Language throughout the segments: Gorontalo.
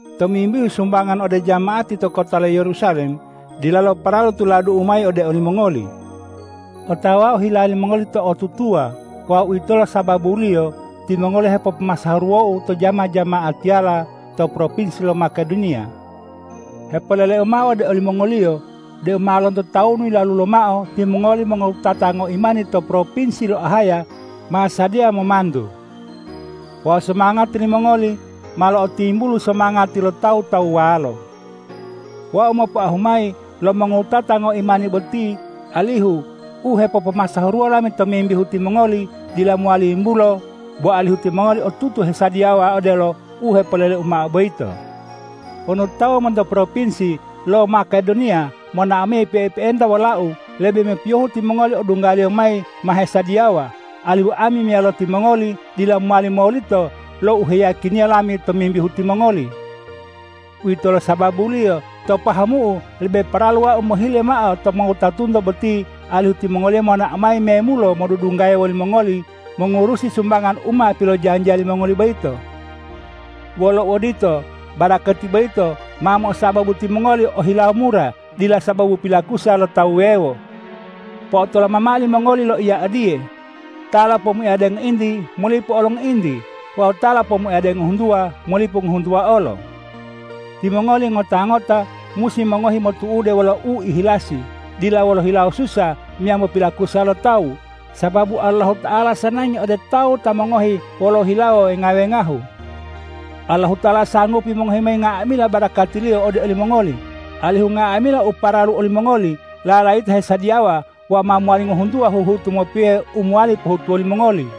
Tomimbihu sumbangan ode jama'ati to kota lo Yerusalem, dilalo paralu tuladu'u mayi ode olimongoli. Otawau hila limongoli to'otutuwa wawu uwitolo sababuliyo timongoli hepopomasahuruwou to jama-jama'atiyala to propinsi lo Makedoniya. Hepoleleu mao ode olimongoliyo deu ma lonto tawunu yilalu lomao timongoli mongowutata ngoimani to propinsi lo Ahaya ma sadiya momantu. Wawu somangati limongoli ma lo'otimbulu somangati lo tawu-tawuwalo. Wau mopoahu mayi lo mongowutata ngoimani boti alihu u hepopomasahuruwo lami tomimbihu timongoli dila mowali yimbulo, bo alihu timongoli otutu hesadiyawa odelo u hepoleleu mao boyito. Wonu tawu monto propinsi lo Makedoniya monao mayi pe'epe'enta wolau, lebe mopiyohu timongoli odunggaliyo mayi ma hesadiyawa, alihu ami meyalo timongoli dila mowali molito lo u heyiyakiniya lami tomimbihu timongoli. Uwitolo sababuliyo to pahamu'u lebe paralu wau mohile mao to mongowutatunto boti alihu timongoliyo monao mayi memulo modudunggaya wolimongoli mongurusi sumbangan u ma pilojanjiya limongoli boyito. Wolo uodito, barakati boyito ma mo'osababu timongoli o hilawo mura, dila sababu pilakusa lo tawu wuwewo. Po'otoloma mao limongoli loiya odiye: Ta lopomuayade ngointi, molipu olo ngointi; wawu ta lopomuayade ngohuntuwa, molipu ngohuntuwa olo. Timongoli ngota-ngota musi mongohi motu'ude wolo uihilasi, dila wolo hilawo susa meyambo pilakusa lo tawu, sababu Allahuta'ala sanangi ode tawu ta mongohi wolo hilawo wenga-wengahu. Allahuta'ala sanggupi mongohi mayi nga'amila barakati-Liyo ode olimongoli, alihu nga'amila u paralu olimongoli lalayita hesadiyawa wawu ma mowali ngohuntuwa huhutu mopiyohe u mowali pohutuwo limongoli.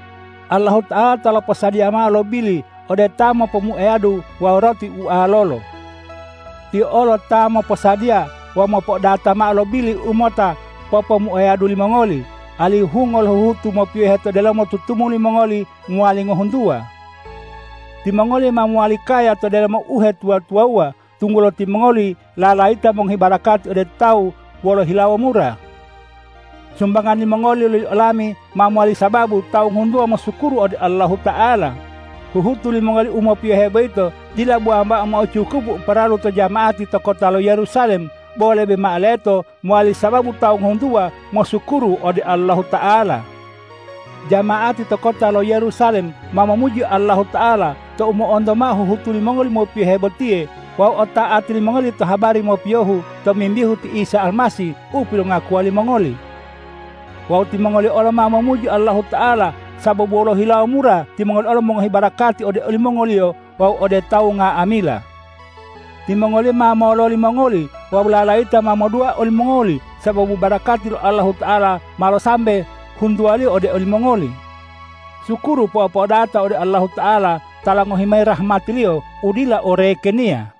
Allahuta'ala ta loposadiya mao lo bili ode ta mopomuayadu wawu roti ualolo. Tiyo olo ta moposadiya wawu mopo'odata mao lo bili u mota popomuayadu limongoli, alihu hungo lo huhutu mopiyohu to delomo tutumuli mongoli mowali ngohuntuwa. Timongoli ma lowali kaya to delomo uhetuwa-tuwawuwa, tunggulo timongoli lalayita mongohi barakati ode tawu wolo hilawo mura. Sumbangan limongoli loli olami, ma mowali sababu tawu ngohuntuwa mosukuru ode Allahuta'ala. Huhutu limongoli u mopiyohe boyito dila bo wambao mo'ocukupu u paralu to jama'ati to kota lo Yerusalem, bo lebe mao leto mowali sababu tawu ngohuntuwa mosukuru ode Allahuta'ala. Jama'ati to kota lo Yerusalem ma momuji Allahuta'ala tou mo'onto mao huhutu limongoli mopiyohe botiye wawu ota'ati limongoli to habari mopiyohu tomimbihu ti Isa Almasih u pilongakuwa limongoli. Wawu timongoliyo olo ma momuji Allahuta'ala sababu wolo hilawo mura timongoli olo mongohi barakati ode olimongoliyo wawu ode tawu nga'amila. Timongoliyo ma mololi mongoli wawu lalayita ma modua olimongoli sababu barakati lo Allahuta'ala malo sambe huntuwaliyo ode olimongoli. Sukuru po'o-po'odata ode Allahuta'ala ta longohi mayi rahmati-Liyo u dila orekeniya!